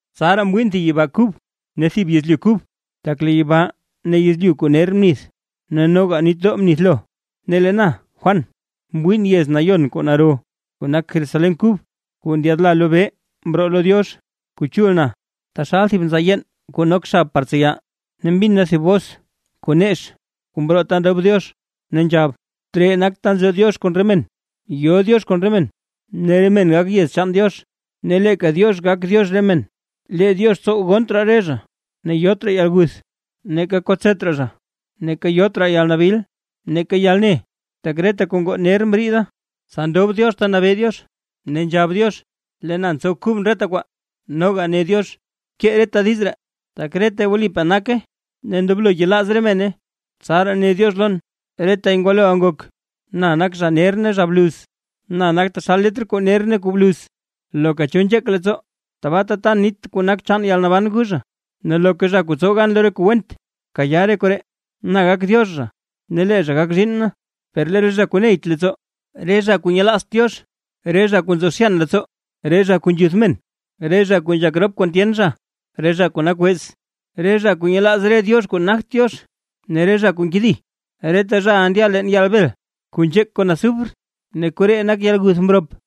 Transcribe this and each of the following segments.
Tsaraa mwiin thib yibaa kub ne thib yezlyu kub, tak lee yibaa ne yezlyu kuu ner mnith ne noga nitdoo mnithlo. Ne lee na Juan, mwiin yez nayon kuu naro, kuu nak Jerusalén kub, kuu ndyaadla lobee mroo lo Diox. Kuu chul na taxal thib nzaa yeen kuu nok xab par tseya. Ne mbin na thib bos kuu nex kuu mroo ta ndob Diox ne nzhab: ―Tree nak ta nzo Diox kon re men. Yo Diox kon re men, ne re men gak yez chaan Diox, ne leeka Diox gak Diox re men. Lee Diox tsow gonnt raa re zha, ne yot raa yalguth, neeka kotset raa zha, neeka yot raa nabil, neeka yalne, tak reta kuu ngoo ner mriida. Tsa ndob Diox ta nabee Diox, ne nzhab Diox: ―Lee na ntsow kubʼn reta kwaa. Noga ne Diox: ―Bkee reta diiz ree, tak retay wlipaa naka ne ndoblo yelaaz re mene. Tsaraa ne Diox lon: ―Retay ngwaloʼa ngok. Na nak zha ner ne zha bluz, na nak taxal letr kuu ner ne kuu bluz. Loka cho nzheek leettsoo, tbaata tan nit kuu nak chaan yalnaban gu zha. Ne loka zha kuu tsow gan lo re kuu went, kayaa re koree, na gak Diox zha ne lee zha gak zhiinn na. Per lee re zha kuu neyt leettsoo, re zha kuu nyelaazt Diox, re zha kuu nzo zhyan leettsoo, re zha kuu nzhuth men, re zha kuu nzhak rop kon tyen zha, re zha kuu nak wez, re zha kuu nyelaaz re diox kuu nagt Diox, ne re zha kuu nkedi. Reta zhaʼa ndya leen yaal bel kuu nzheek kon azufre, ne koree nak yalguth mrop.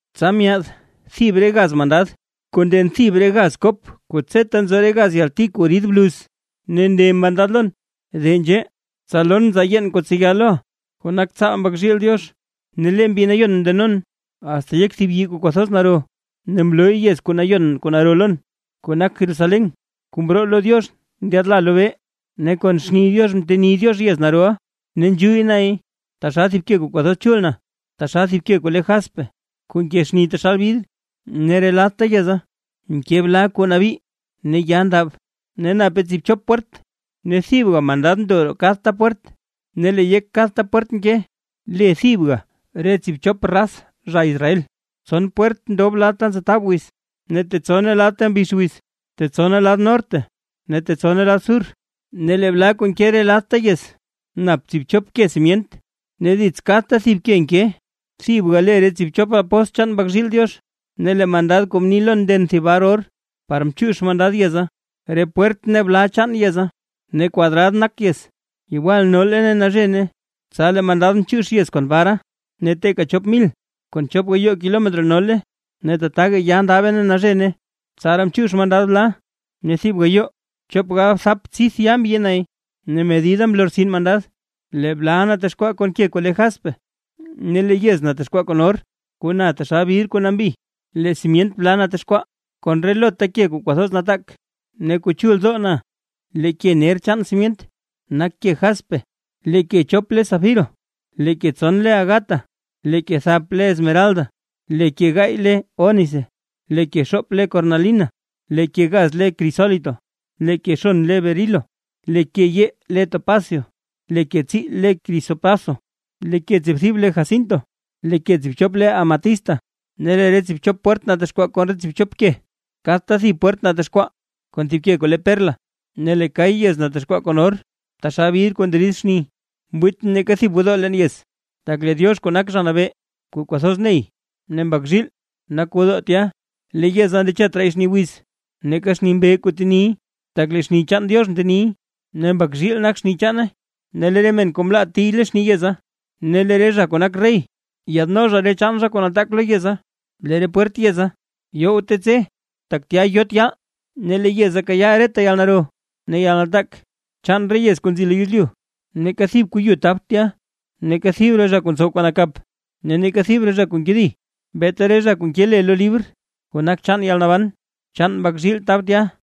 Tsa myaad thib re gaz mandad, kuu nden thib re gaz kop kuu tseta nzo re gaz yalti kuu rid bluz, ne ne mandad lon: ―De nzhee, tsa lon nzaa yeen kuu tseya loʼa, kuu nak tsaal Mbak zhiil Diox. Ne lee Mbi Nayon mndenon, asta yek thib yii kuu kwathoz naro, ne mlooy yez nayon kuu naro lon, kuu nak Jerusalén kuu mroo lo Diox ndyaadla lobee. Ne kon xni Diox nteni Diox yez naroʼa, ne nzhuyy nay taxal thib ke kuu kwathoz chul na, taxal thib ke kuu le jaspe, kuu nke xni taxal bidr. Ne re ladta yeza nke bla kuu nabii ne ya ndab, ne nape tsiibchop pwert, ne thibga mandad ndo roo kadta pwert; ne lee yek kadta pwert nke le thibga re tsiibchop raz zha Israel. Tson pwert ndob lad ta ntsetab wiz, tetsone lad ta mbix wiz, tetsone lad norte ne tetsone lad sur. Ne lee bla kuu nke re ladta yez, nap tsiibchop ke simyent, ne dits kadta thib ke nke, thibga le re tsiibchop apóstl chaan Mbak zhiil Diox. Ne lee mandad kuu mni lon nden thib bar or, par chiix mandad yeza, re pwert ne bla chaan yeza. Ne kwadrad nak yez, yewal nole ne nazhene. Tsa lee mandad mchiix yez kon bara, ne teeka chop mil kon chop gayoo kilometro nole, ne tataga ya ndabe ne nazhene. Tsaraa mchiix mandad bla, ne thib gayoo chop galbthap tsidth yaa mbyi nay ne medida mlortsin mandad. Lee bla natexkwaa kon ke kuu le jaspe, ne lee yez natexkwaa kon or, kuu na taxal bidr kuu nambi. Lee simyent bla natexkwaa kon relota ke kuu kwathoz nataak ne kuu chuldoo na: lee ke ner chaan simyent nak ke jaspe, lee ke chop le safiro, lee ke tson le ágata, lee ke thap le esmeralda, lee ke gaay le ónice, lee ke xoop le kornalina, lee ke gaz le krisólito, lee ke xon le berilo, lee ke yee le topasio, lee ke tsii le krisopraso, lee ke tsiibthib le jacinto, lee ke tsiibchop le amatista. Ne lee re tsiibchop pwert natexkwaa kon tsiibchop ke, kadta thib pwert natexkwaa kon thib thib ke kuu le perla. Ne lee kay yez natexkwaa kon or, taxal bidr kuu nderid xni. Mwiitʼn neeka thib gwodoo leen yez, tak lee Diox kuu nak Zha Nabee kuu kwathoz ney ne Mbak zhiil nak gwodoo tya. Lee yeza ndechet raay xni wiz, neeka xni mbee kuu teniy, tak lee xni chaan Diox nteniy, ne Mbak zhiil nak xni chaane. Ne lee re men kuu mlaa tiy lo xni yeza, ne lee re zha kuu nak rey yaadno re chaan kuu nataak lo yeza. Lee re pwert yeza yowte tse, tak tya yot yaal. Ne lee yeza kayaa reta yalnaro ne yalnataak chaan re yez kuu nzi lo yezlyu. Neeka thib kuu yu tabt tya, ne neeka thib re zha kuu ntsow kuu nakap, ne neeka thib zha kuu nkedi; beeta re zha kuu nke le lo libr kuu nak chaan yalnaban chaan Mbak zhiil tab tya.